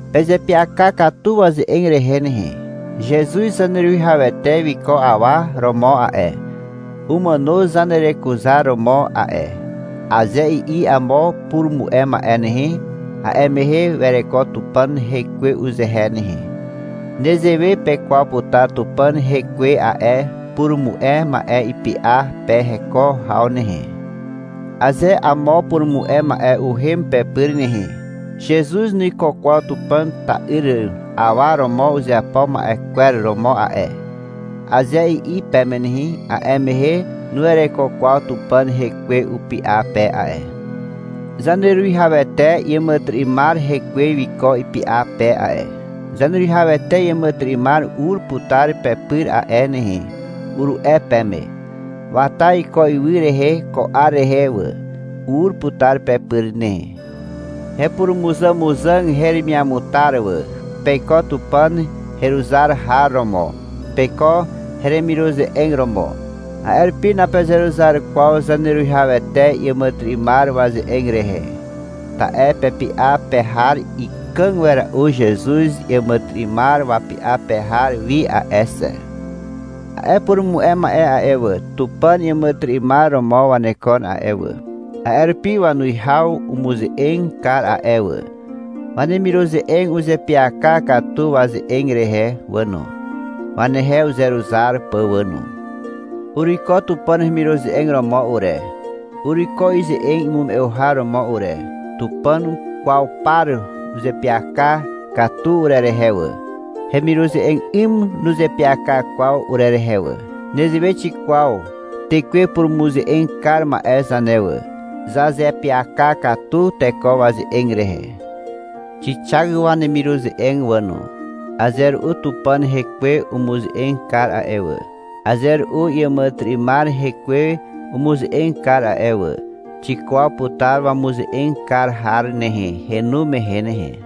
Pezeapyaka katu waze'eg rehe nehe. — Zezuz Zaneruwihawete wiko awa romo a'e, umàno zanerekuzaromo a'e, aze i'i amo purumu'e ma'e nehe, a'e mehe wereko Tupàn Hekwe uzehe nehe. Nezewe pekwaw putar Tupàn Hekwe a'e purumu'e ma'e ipy'a pe heko haw nehe. Aze amo purumu'e ma'e uhem pepyr nehe, — Zezuz nuiko kwaw Tupàn ta'yr awa romo uzeapo ma'e kwer romo a'e, aze i'i peme nehe, a'e mehe nuwereko kwaw Tupàn Hekwe upy'a pe a'e. Zaneruwihawete iàmàtyry'ymar hekwe wiko ipy'a pe a'e. — Zaneruwihawete iàmàtyry'ymar ur putar pepyr a'e nehe, uru'e peme. Wata iko ywy rehe ko 'ar rehe wà. Ur putar pepyr nehe. Hepurumuzàmuzàg heremiamutar wà. Peiko Tupàn heruzar har romo, peiko hemiruze'eg romo. A'e rupi napezeruzar kwaw Zaneruwihawete iàmàtyry'ymar waze'eg rehe. Ta'e pepy'a pe har ikàg wera'u Zezuz iàmàtyry'ymar wapy'a pe har wi a'e xe. A'e purumu'e ma'e a'e wà, Tupàn iàmàtyry'ymar romo wanekon a'e wà, A'e rupi wanuwihaw umuze'eg kar a'e wà. Wanemiruze'eg uzeapyaka katu waze'eg rehe wà no, wanehe uzeruzar pà wà no. Uruiko Tupàn hemiruze'eg romo ure, uruiko ize'eg imume'u har romo ure. Tupàn kwaw par uzeapyaka katu urerehe wà. Hemiruze'eg 'ym nuzeapyaka kwaw urerehe wà. Nezewe xikwaw tekwe purumuze'eg kar ma'e zane wà. Zazeapyaka katu teko waze'eg rehe. Xixak wanemiruze'eg wà no. Aze ru'u Tupàn Hekwe umuze'eg kar a'e wà. Aze ru'u iàmàtyry'ymar hekwe umuze'eg kar a'e wà. Xikwaw putar wamuze'eg kar har nehe, henu mehe nehe.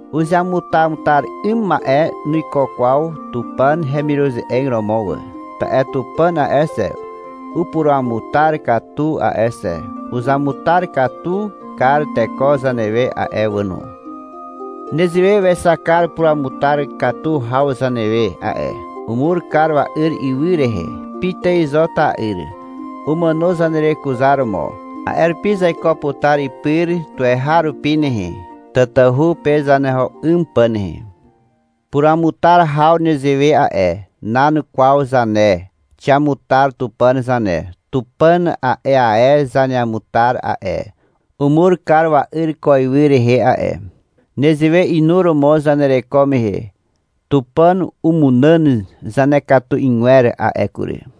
Uzeamutamutar 'ym ma'e nuiko kwaw Tupàn hemiruze'eg romo wà. Ta'e Tupàn a'e xe, upuruamutar katu a'e xe. Uzamutar katu kar teko zanewe a'e wà no. Nezewe wexak kar puruamutar katu haw zanewe a'e. Umur kar wa'yr ywy rehe. Pitài zo ta'yr. Umàno zanerekuzaromo. A'e rupi zaiko putar ipyr tuweharupi nehe, tatahu pe zaneho 'ym pà nehe. Puramutar haw nezewe a'e. Nan kwaw zane. Xiamutar Tupàn zane. Tupàn a'e ae zaneamutar a'e. Umur kar wa'yr ko ywy rehe a'e. Nezewe inuromo zanereko mehe Tupàn umunàn zanekatu 'ygwer a'e kury.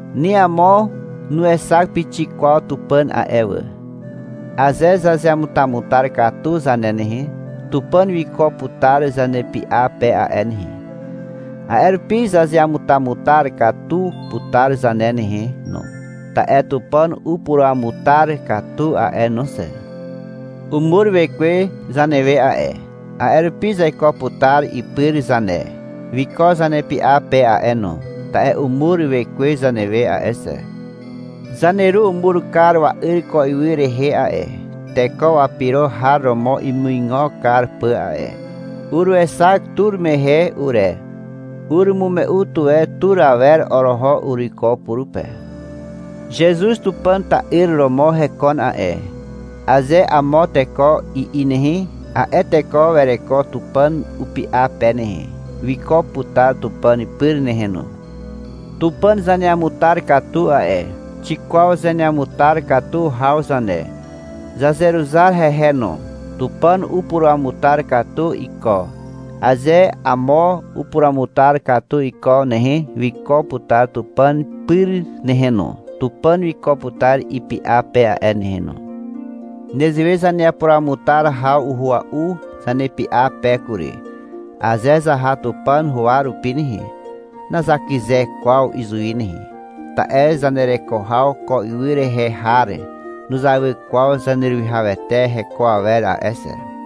Ni amo nuexak pixik kwaw Tupàn a'e wà. Aze zazeamutamutar katu zane nehe, Tupàn wiko putar zanepy'a pe a'e nehe. A'e rupi zazeamutamutar katu putar zane nehe no, ta'e Tupàn upuruamutar katu a'e no xe. Umur Wekwe zanewe a'e, a'e rupi zaiko putar ipyr zane. Wiko zanepy'a pe a'e no, ta'e umur Wekwe zanewe a'e xe. Zaneru umur kar wa'yr ko ywy rehe a'e, teko wapyro har romo imuigo kar pà a'e. Uruexak tur mehe ure. Urumume'u tuwe tur awer oroho uruiko purupe. — Zezuz Tupàn ta'yr romo hekon a'e, aze amo teko i'i nehe, a'e teko wereko Tupàn upy'a pe nehe. Wiko putar Tupàn pyr nehe no. Tupàn zaneamutar katu a'e. Xikwaw zaneamutar katu haw zane. Zazeruzar hehe no. Tupàn upuruamutar katu iko. Aze amo upuruamutar katu iko nehe, wiko putar Tupàn pyr nehe no. Tupàn wiko putar ipy'a pe a'e nehe no. Nezewe zanepuruamutar haw uhua'u zanepy'a pe kury. Aze zaha Tupàn huwa rupi nehe, nazakyze kwaw izuwi nehe. Ta'e zanereko haw ko ywy rehe har nuzawy kwaw Zaneruwihawete heko awer a'e xe.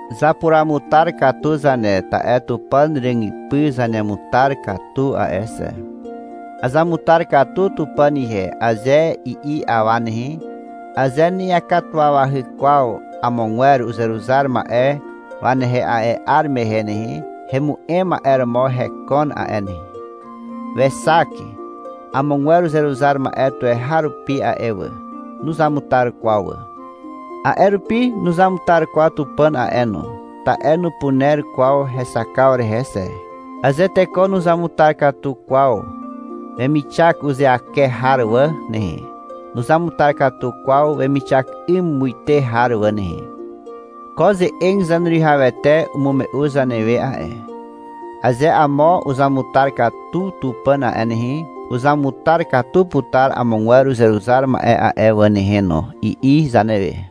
Zapuruamutar katu zane, ta'e Tupàn ràgypy zaneamutar katu a'e xe. — Azamutar katu Tupàn ihe, aze i'i awa nehe, aze na'iakatuwawahy kwaw amogwer uzeruzar ma'e wanehe a'e 'ar mehe nehe, hemu'em ma'e romo hekon a'e nehe. Wexak amogwer uzeruzar ma'e tuweharupi a'e wà. Nuzamutar kwaw wà. A'e rupi nuzamutar kwaw Tupàn a'e no, ta'e nupuner kwaw hexakaw rehe xe. Aze teko nuzamutar katu kwaw wemixak uzeake har wà nehe, nuzamutar katu kwaw wemixak 'ym muite har wà nehe. Ko ze'eg Zaneruwihawete umume'u zanewe a'e. — Aze amo uzamutar katu Tupàn a'e nehe, uzamutar katu putar amogwer uzeruzar ma'e a'e wà nehe no, i'i zanewe.